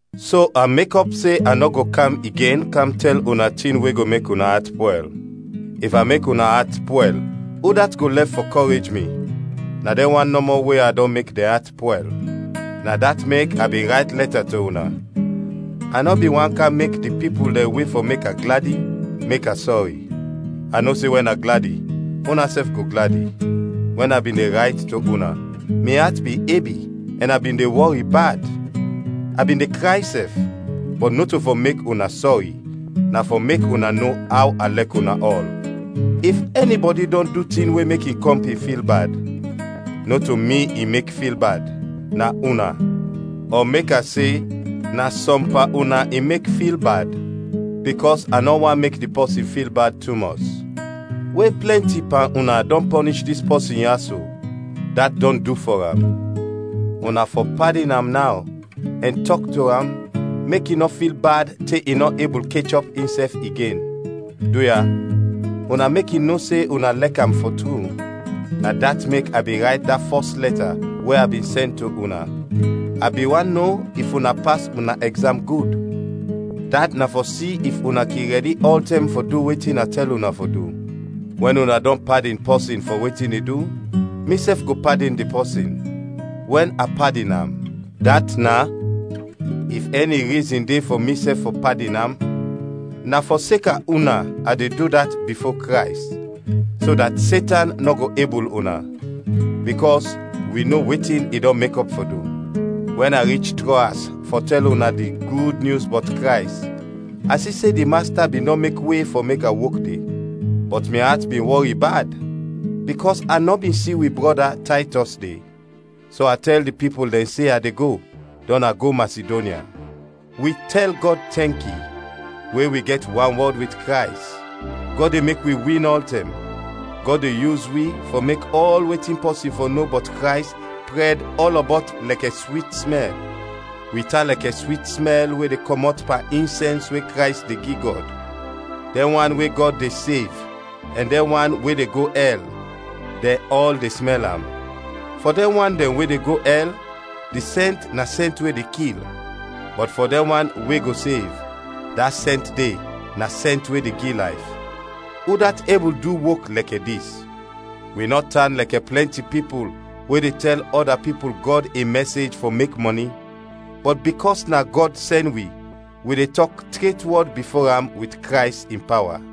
So a mekɔp se a nɔ go kam igen kam tɛl una tin we go mek una at pwɛl. If a mek una at pwɛl, udat go lɛf fɔ kɔrej mi? Na dɛn wan nɔmɔ we a dɔn mek dɛn at pwɛl. Na dat mek a bin rayt lɛta to una, a nɔ bin want kam mek di pipul dɛn we fɔ mek a gladi, mek a sɔri. A no se wɛn a gladi, unasɛf go gladi. Wɛn a bin de rayt to una, mi at bin ebi ɛn a bin de wɔri bad; a bin de kray sɛf; bɔt nɔto fɔ mek una sɔri, na fɔ mek una no aw a lɛk una ɔl. If ɛnibɔdi dɔn du tin we mek in kɔmpin fil bad, nɔto mi i mek fil bad, na una; ɔ mek a se, na sɔm pan una i mek fil bad, bikɔs a nɔ want mek di pɔsin fil bad tumɔs. We plɛnti pan una dɔn pɔnish dis pɔsin ya so, dat dɔn du fɔ am. Una fɔ padin am naw, ɛn tɔk to am, mek i nɔ fil bad te i nɔ ebul kechɔp insɛf igen. Duya, una mek i no se una lɛk am fɔ tru. Na dat mek a bin rayt da fɔs lɛta we a bin sɛn to una. A bin want no if una pas una ɛgzam gud; dat na fɔ si if una kin rɛdi ɔltɛm fɔ du wetin a tɛl una fɔ du. Wɛn una dɔn padin pɔsin fɔ wetin i du, misɛf go padin di pɔsin. Wɛn a padin am, dat is, if ɛni rizin de fɔ misɛf fɔ padin am, na fɔseka una a de du dat bifo Krays, so dat Setan nɔ go ebul una; bikɔs wi no wetin i dɔn mekɔp fɔ du. Wɛn a rich Troas fɔ tɛl una di Gud Nyus bɔt Krays, a si se di Masta bin dɔn mek we fɔ mek a wok de. Bɔt mi at bin wɔri bad, bikɔs a nɔ bin si wi brɔda, Taytɔs, de. So a tɛl di pipul dɛn de se a de go, dɔn a go Masidonya. Wi tɛl Gɔd tɛnki! We wi gɛt wanwɔd wit Krays, Gɔd de mek wi win ɔltɛm. Gɔd de yus wi fɔ mek ɔl wetin pɔsin fɔ no bɔt Krays prɛd ɔlɔbɔt lɛkɛ swit smɛl. Wi tan lɛkɛ swit smɛl we de kɔmɔt pan insɛns we Krays de gi Gɔd; dɛn wan we Gɔd de sev ɛn dɛn wan we de go ɛl, dɛn ɔl de smɛl am. Fɔ dɛn wan dɛn we de go ɛl, di sɛnt na sɛnt we de kil; bɔt fɔ dɛn wan we go sev, da sɛnt de na sɛnt we de gi layf. Udat ebul du wok lɛkɛ dis? Wi nɔ tan lɛkɛ plɛnti pipul we de tɛl ɔda pipul Gɔd in mɛsej fɔ mek mɔni, bɔt bikɔs na Gɔd sɛn wi, wi de tɔk tret wɔd bifo am wit Krays in pawa.